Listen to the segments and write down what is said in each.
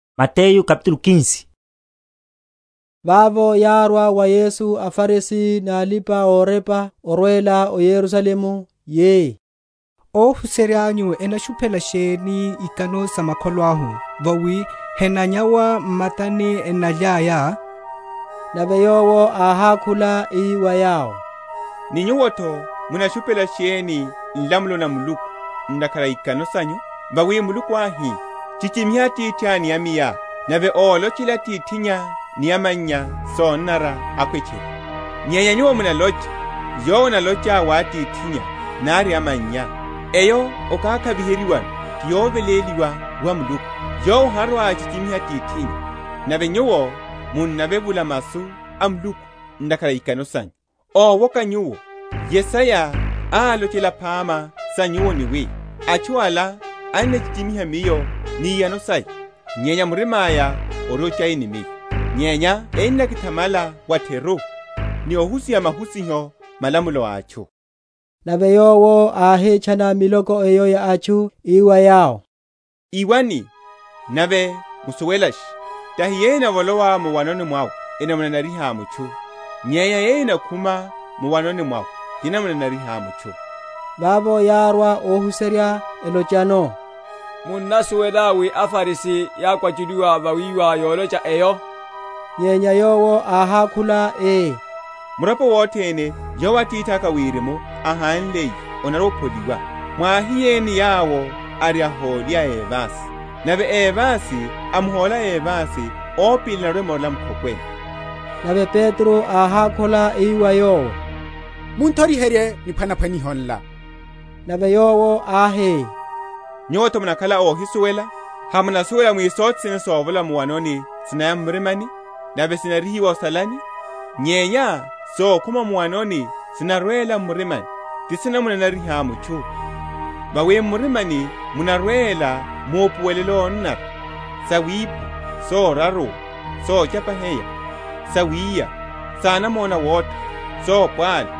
Ikano sa makholo. Vavo yárwa wa Yesu aFarisi ni alipa‐orepa, órwela o Yerusalemu, yi, Óhuserya’nyu enashuphela sheni ikano sa makholo? vawi henanyawa m’matani enalyaya. Nave Yowo áhákhula, ii wa yawo, Ni nyuwo’tho munashuphela sheni nlamulo na Muluku ntakhara a ikano sanyu? Vawi Muluku áhi, Chichimiha atithá ni amayá; nave, Ólochela atithinnya ni amannya sonanara, akhwe tchiri. Nyenya nyuwo munalocha, Yowo analocha wa atithinnya nari amannya, Eyo okakhaviheryiwano, ti yoveléliwa wa Muluku; yowo harwa‐achichimiha atithinnya. Nave nyuwo munavevula masu a Muluku ntakhara a ikano sanyu. Ówoka nyuwo! Yesaya álochela phama sa nyuwo, ni wi, Atchu ala enakichichimiha Miyo ni iyano saya; Nyenya murima’ya ori ochai ni Miyo. Nyenya enakithamala wa’theru, Ni ohusiha mahusiho, malamulo a atchu. Nave Yowo áhitchana miloko eyo ya atchu, ii wa yawo, Iwani, nave musuwelashe: tahi yeyo enavolowa mu’wanoni mwawe enamunanariha mutchu; nyenya yeyo enakhuma mu’wanoni mwawe, tinamunanariha mutchu. Vavo yárwa ohuserya, elochano, Munnasuwela wi aFarisi yákwachuliwa vawíwa yolocha eyo? Nyenya Yowo áhákhula ii, Muropo wothene, yowo Atithaka a Wirimu ahánliye, onarwa‐opholiwa. Mwahiyeni yawo, ari ahóli a evasi. Nave évasi amuhóla évasi, opili enarwa‐emorela mu’khokweni. Nave Petro áhákhula ii wa Yowo, Mun’thoriherye niphwanaphwaniho nla. Nave Yowo áhi, Nyuwo’tho munakhala ohísuwelela? Hamunasuwela wi sothene sovolowa mu’wanoni sinaya m’mirimani, nave sinarihiwa o’salani? Nyenya sokhuma mu’wanoni sinarwela m’murimani; tisinamu?-?nanariha mutchu. Vawi m’murimani munarwela maupuwelo ónanara, sawipha, soraruwa, sochapaheya, sawiya, sanamona awotha, sopwalu;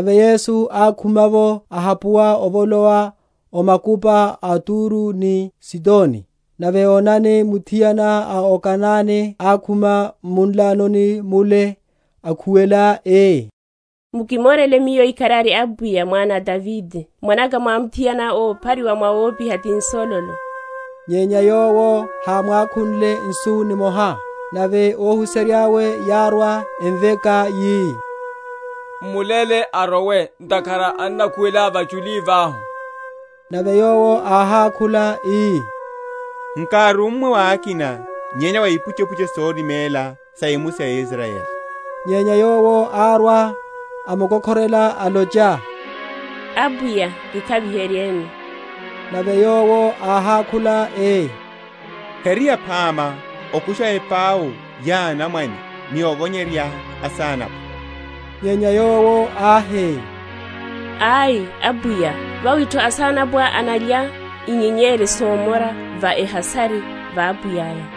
Nave Yesu ákhuma’vo ahapuwa ovolowa o makupa a Turo ni Sidoni. Nave onani, Muthiana a o Kanane ákhuma m’munlanoni mule, akhuwela, ii, Mukimorele miyo ikharari Apwiya, mwana a Davide; mwanaka mwamuthiana óphariwa wawopiha ti nsololo. Nyenya Yowo hámwakhunle nsu nimoha. Nave óhuserya’we yárwa, emveka, yi, M’muléle arowe; ntakhara annakhuwela vachuli vahu. Nave Yowo áhákhula, ii, Nkárummwe wa akina nyenya wa ipuchepuche sorimela sa emusi ya Israyeli. Nyenya yowo árwa, amukokhorela, alocha, Apwiya, kikhaviheryeni. Nave Yowo áhákhula, ii, Heri yaphama okusha epau ya anamwane, ni ovonyerya asanapwa. Nyenya yowo áhi, Ai, Apwiya, vawi’tho asanapwa enalya inyenyeri somora va ehasari va apwiya’ya.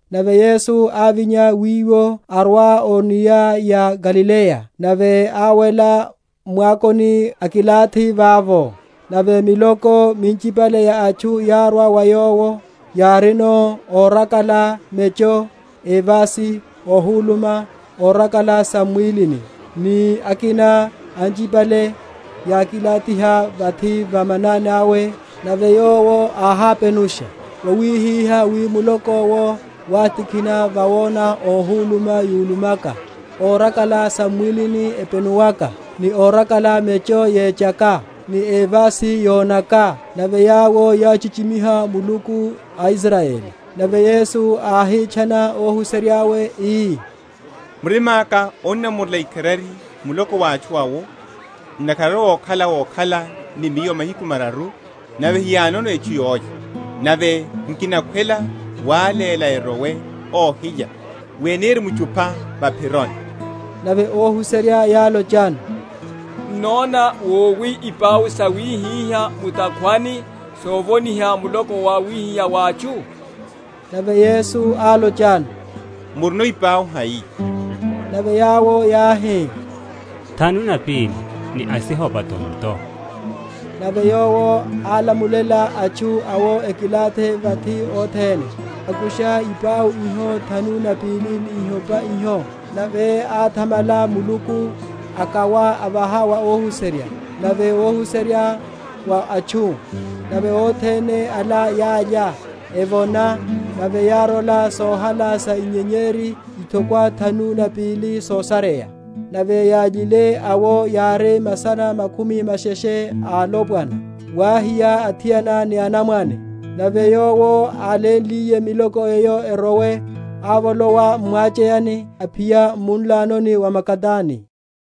Nave Yesu ávinya wiwo, arwa o enia ya Galileya, nave áwela m’mwakoni, akilathi vavo. Nave miloko minchipale ya atchu yárwa wa Yowo, yárino órakala mecho, évasi, óhuluma, órakala sam’mwílini, ni akina anchipale, yakilathiha vathi va manani awe: nave Yowo áhápenusha: wawihihá wi muloko’wo wátikhina, vawona óhuluma yulumaka, órakala sam’mwílini epenuwaka, ni órakala mecho yechaka, ni évasi yonaka, nave yawo yáchichimiha Muluku a Israyeli. Nave Yesu áhitchana óhuserya’we, ii, Murima’ka onnamorela ikharari muloko wa atchu awo, ntakhara ari okhala wokhala ni Miyo mahiku mararu, nave heyánono etchu yólya, nave nkinakhwela wáléla erowe óhilya, wi enirimchupha va’phironi. Nave óhuserya yálochano, n’nóna wowi ipau sawihiha mu’takhwani sovoniha muloko wawihiha wa atchu? Nave Yesu álochano, Murino ipau hai? Nave yawo yáhi, Thanu na pili ni asihopa tonto. Nave Yowo álamulela atchu awo ekilathi vathi othene: akusha ipau iho thanu na pili ni ihopa iho; nave áthamala Muluku, akawa, avaha wa óhuserya, nave óhuserya wa atchu. Nave othene ala yálya, evona: nave yárola sohala sa inyenyeri ithokwa thanu na pili sosareya. Nave yályile awo yári masana makhumi masheshe a alopwana, wáhiya athiana ni anamwane. Nave Yowo álénliye miloko eyo erowe, ávolowa m’mwacheyani, aphiya m’munlanoni wa Magadani.